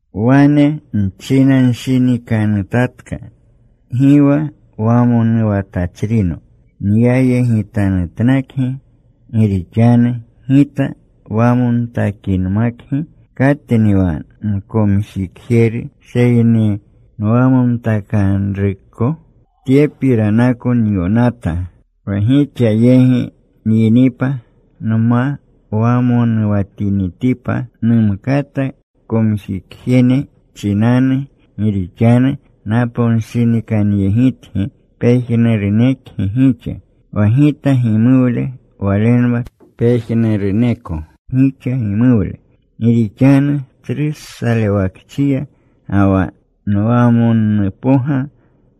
Wane nchinanshinikanutatka, gi wa wamonuwatachrino nyayegitanutnakgi. Gi rixanu gita wamontakinmakgi, ¿katni wa nkomjikjeru seyni nwamontakanruko? Tyepiranako nyonata, wa gixa yegi nyinipa, nma wamonuwatinitipa numkata komjikjene chinanu. Gi rixanu naponshinikanyegitgi pejnurunekgi gixa, wa gita gimuwle walenwa pejnuruneko gixa gimuwle. Gi rixanu tsru salewakchiya ga wa nwamonnupoga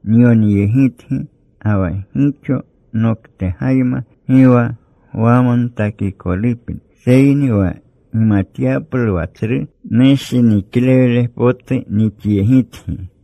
nyonyegitgi ga wa gixo noktegayma, gi wa gwamontakikolupni, seyni wa gimatyaplu wa tsru nushiniklewle potu nixyegitgi.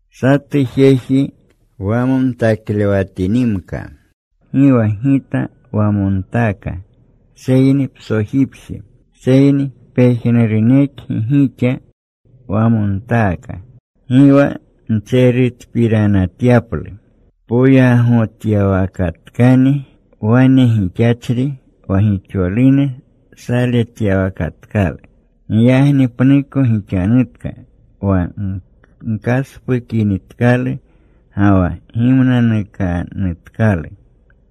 Satu jeji wamontaklewatinimka, gi wa gita wamontaaka seyni psojipje, seyni pejnurunekgi gixa wamontaaka. Gi wa ntserutpiranatyaplu. Poyagotyawakatkani wane gixachri wa gixolune saletyawakatkalu. Giyagni pnuko gixanutka, wa gkaspukinitkalu. Ga wa gimnanukanutkalu.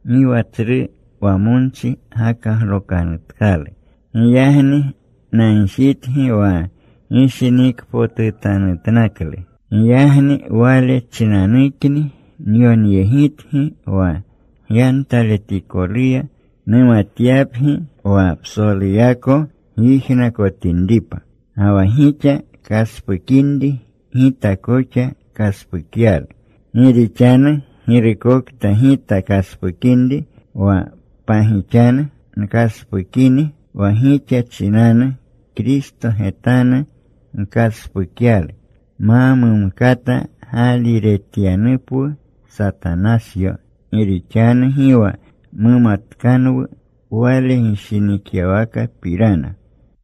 Gi wa tsru wamonchi gakaglokanutkalu. Giyagni nagjitgi, wa gishinikpotutanutnaklu. Giyagni wale chinanukni nyonyegitgi wa gyantaletikoluya numatyapgi wa psoluyako gyijnakotinripa. Ga wa gixa kaspukinri, gita koxa kaspukyalu. Gi rixanu girukokta gita kaspukinri wa pagixanu nkaspukini wa gixa chinanu Kristo getanu nkaspukyalu, ma mumkata gaaliretyanupwu Satanasyo. Gi rixanu gi wa mumatkanwu wale gishinikyawakapirana.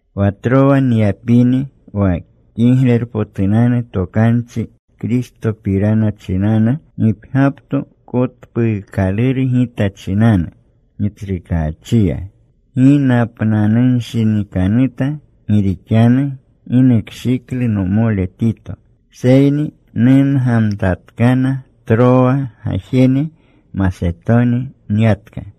Wa Trowa nyapini wa Kiglerpotunanu Tokanchi Kristopirana chinanu, gipgyapto kotpuukaluru gita chinanu Gitsrukaachiya. Gi napnanunshinikanuta gi rixanu gi nukshiklu nomole Tito. Seyni nungamtatkana Trowa gajjene; Masetoni nyatka.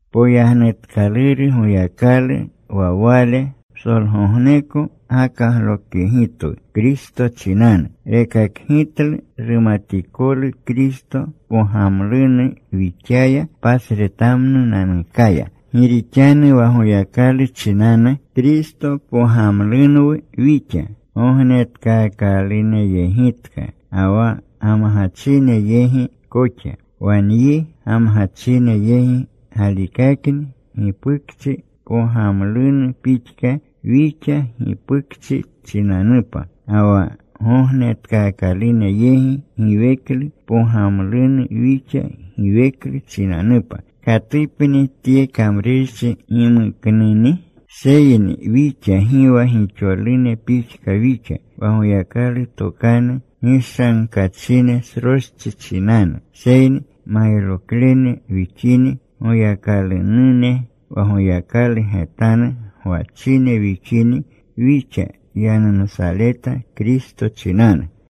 Poyagnutkaluru Goyakalu wa Wale psolgogneko gakaglokyegitwu Kristo chinanu. Rekakgitlu rumatikolu Kristo pogamlunu wixaya pasretamnunanukaya. Gi rixanu wa Goyakalu chinanu Kristo pogamlunwu wixa, gognetkaakaluneyegitka ga wa gamgachine yegi koxa. Wa nyi gamgachine yegi galikakni gipukchi pogamlunu pixka wixa gipukchi chinanupa. Ga wa gognetkaakalune yegi giweklu pogamlunu wixa giweklu chinanupa. ¿Katupni tye kamrurchi gimuknuni? Seyni wixa gi wa gixolune pixka wixa, wa Goyakalu tokanu gishankachine sroschi chinanu, seyni mayroklene wixini, Goyakalunune wa Goyakalu getanu gwachine wixini wixa yanumsaleta Kristo chinanu.